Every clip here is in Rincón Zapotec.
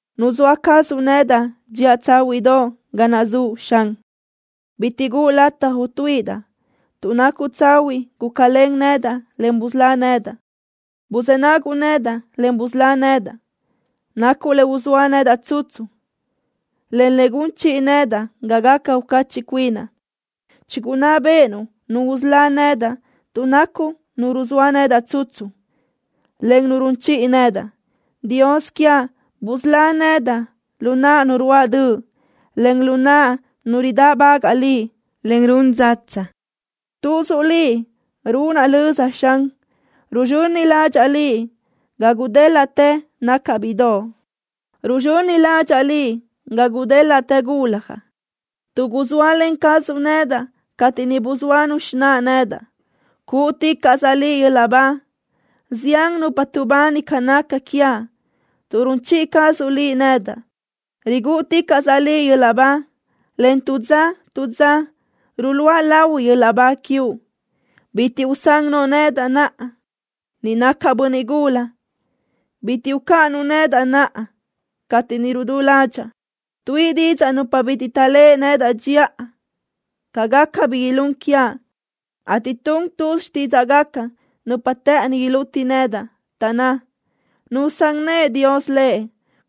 Nuzóa cazuʼ nedaʼ dxiʼa tsáhuiʼdoʼ ga naʼ zuʼ, Xan. ¡Bitiʼ guʼu lataj utuíʼidaʼ! ¡Tuʼ nacuʼ tsahuiʼ gúcalen nedaʼ, en busölá nedaʼ! ¡Buzë́ naguʼ nedaʼ, en busölá nedaʼ! Nacuʼ le uzóa nedaʼ tsutsu, en le gun chiʼi nedaʼ ga gaca ucachiʼ cuinaʼ. Chigunná béʼenuʼ nu usölá nedaʼ tuʼ nacuʼ Nu ruzóa nedaʼ tsutsu, en Nu run chiʼi nedaʼ. Dios quiaʼ, busölá nedaʼ lu naʼ nu ruáʼ döʼ, en lu naʼ nu ridáʼbagaʼ Liʼ, en run dzatsa. Tuzuʼ Liʼ runaʼ löza, Xan. Ruzxöni ládxaʼa Liʼ ga gudélaʼtë nacaʼ bíʼidoʼ. Ruzxöni ládxaʼa Liʼ ga gudélaʼtë guljaʼ, tuʼ guzóalen cazuʼ nedaʼ cateʼ niʼ buzóanu xináʼa nedaʼ. ¡Cúʼuticaʼsaʼ Liʼ yöl-laʼ ba! Zián nupa tuʼbani ca naca quiaʼ, tuʼ run chiʼi cazuʼ Liʼ nedaʼ. ¡Rigúʼuticaʼsaʼ Liʼ yöl-laʼ ba, en tu dza tu dza ruluʼa lahui yöl-laʼ ba quiuʼ! ¡Bitiʼ usán noʼo nedaʼ naʼa, ni nacaʼ bönniʼ gula! ¡Bitiʼ ucáʼanuʼ nedaʼ naʼa cateʼ ni rudú ládxaʼa! Tuíʼi didzaʼ nupa bitiʼ taʼléʼe nedaʼ dxiʼa ca gaca bi ilún quiaʼ, ateʼ tun tuz xtídzaʼgaca nupa të́ʼëni iluti nedaʼ. Taʼnná: “¡Nusán nëʼë Dios lëʼ!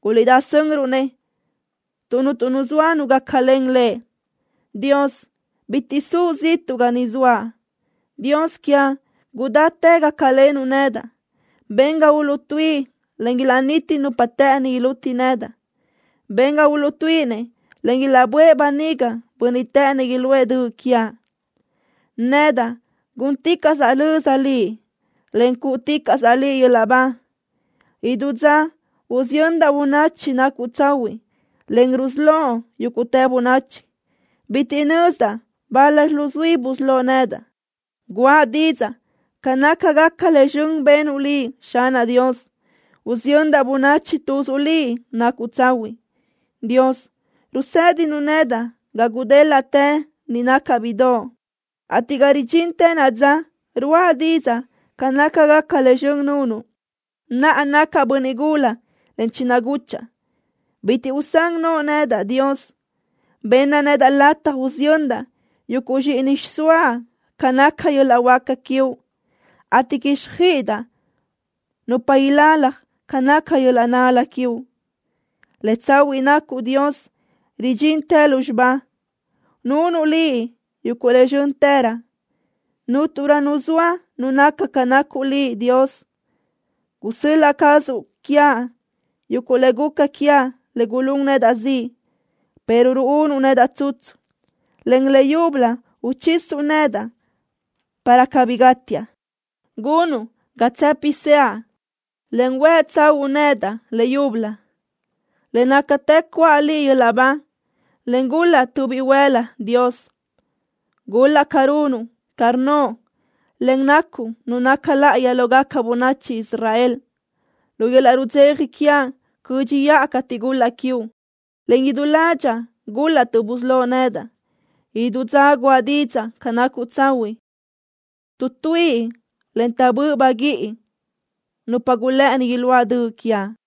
¡Guliʼdá sönruʼ-nëʼ tuʼ cuntu nu zoa gácalen lëʼ!” ¡Dios, bitiʼ suʼ ziʼtuʼ ga ni zoaʼ! ¡Dios quiaʼ, gudáchi gácalenuʼ nedaʼ! Ben ga uluʼtuíʼi, en ilaʼniti nupa të́ʼëni iluti nedaʼ. Ben ga uluʼtuíʼinëʼ, en ilaʼböʼë böniga bönniʼ të́ʼënëʼ iluʼë döʼ quiaʼ. ¡Nedaʼ gúnticaʼsaʼ löza Liʼ, en cúʼuticaʼsaʼ Liʼ yöl-laʼ ba! Idú dza usiyöndaʼ bönachi nacuʼ tsahuiʼ, en rusölóʼ yúguʼtë bönachi. Bitiʼ nözdaʼ bal-laxi luzuí busölóʼ nedaʼ. ¡Guʼa didzaʼ ca nácagaca le zxön benuʼ Liʼ, Xanaʼ Dios! ¡Usiyöndaʼ bönachi tuzuʼ Liʼ nacuʼ tsahuiʼ! Dios, rusédinuʼ nedaʼ ga gudélaʼtë niʼ nacaʼ bíʼidoʼ, ateʼ ga ridxintë naʼa dza ruáʼa didzaʼ ca nácagaca le zxön nunuʼ. Naʼa nacaʼ bönniʼ gula, en chinaguchaʼ. ¡Bitiʼ usán noʼo nedaʼ, Dios! Benna nedaʼ lataj usiyöndaʼ yuguʼ zxíʼini xsoaʼ ca naca yöl-laʼ huáca quiuʼ, ateʼ quíxjöiʼidaʼ nupa ilalaj ca naca yöl-laʼ nál-la quiuʼ. ¡Le tsahuiʼ nacuʼ, Dios, ridxintë lúzxiba! ¡Nunuʼ Liʼ yuguʼ le zxö́ntërö! ¡Cúnturö nu zoa nu naca ca nacuʼ Liʼ, Dios! Gusöl-laʼ cazuʼ quiaʼ yuguʼ le guca quiaʼ le gulún nedaʼ ziʼ, pero ruúnuʼ nedaʼ tsutsu, en le yúbölö uchisuʼ nedaʼ para cabí gátiaʼ. Gunuʼ ga tsë́piseaʼ, en huë tsahúʼu nedaʼ le yúbölö. ¡Le nácatë cuʼa Liʼ yöl-laʼ ba, en gul-laʼ tu bihuël-la, Dios! ¡Gul-laʼ ca runuʼ ca rnnoʼ, en nacuʼ Nu naca láʼayi lógaca bönachi Israel! ¡Lu yöl-laʼ rudzeja quiaʼ cö́dxiʼa cateʼ gul-laʼ quiuʼ, en idú ládxaʼa gul-laʼ tuʼ busölóʼ nedaʼ! ¡Idú dza guʼa didzaʼ ca nacuʼ tsahuiʼ! ¡Tuʼtuíʼi, en taʼbö́ʼ baguíʼi nupa gulë́ʼëni iluáʼ döʼ quiaʼ!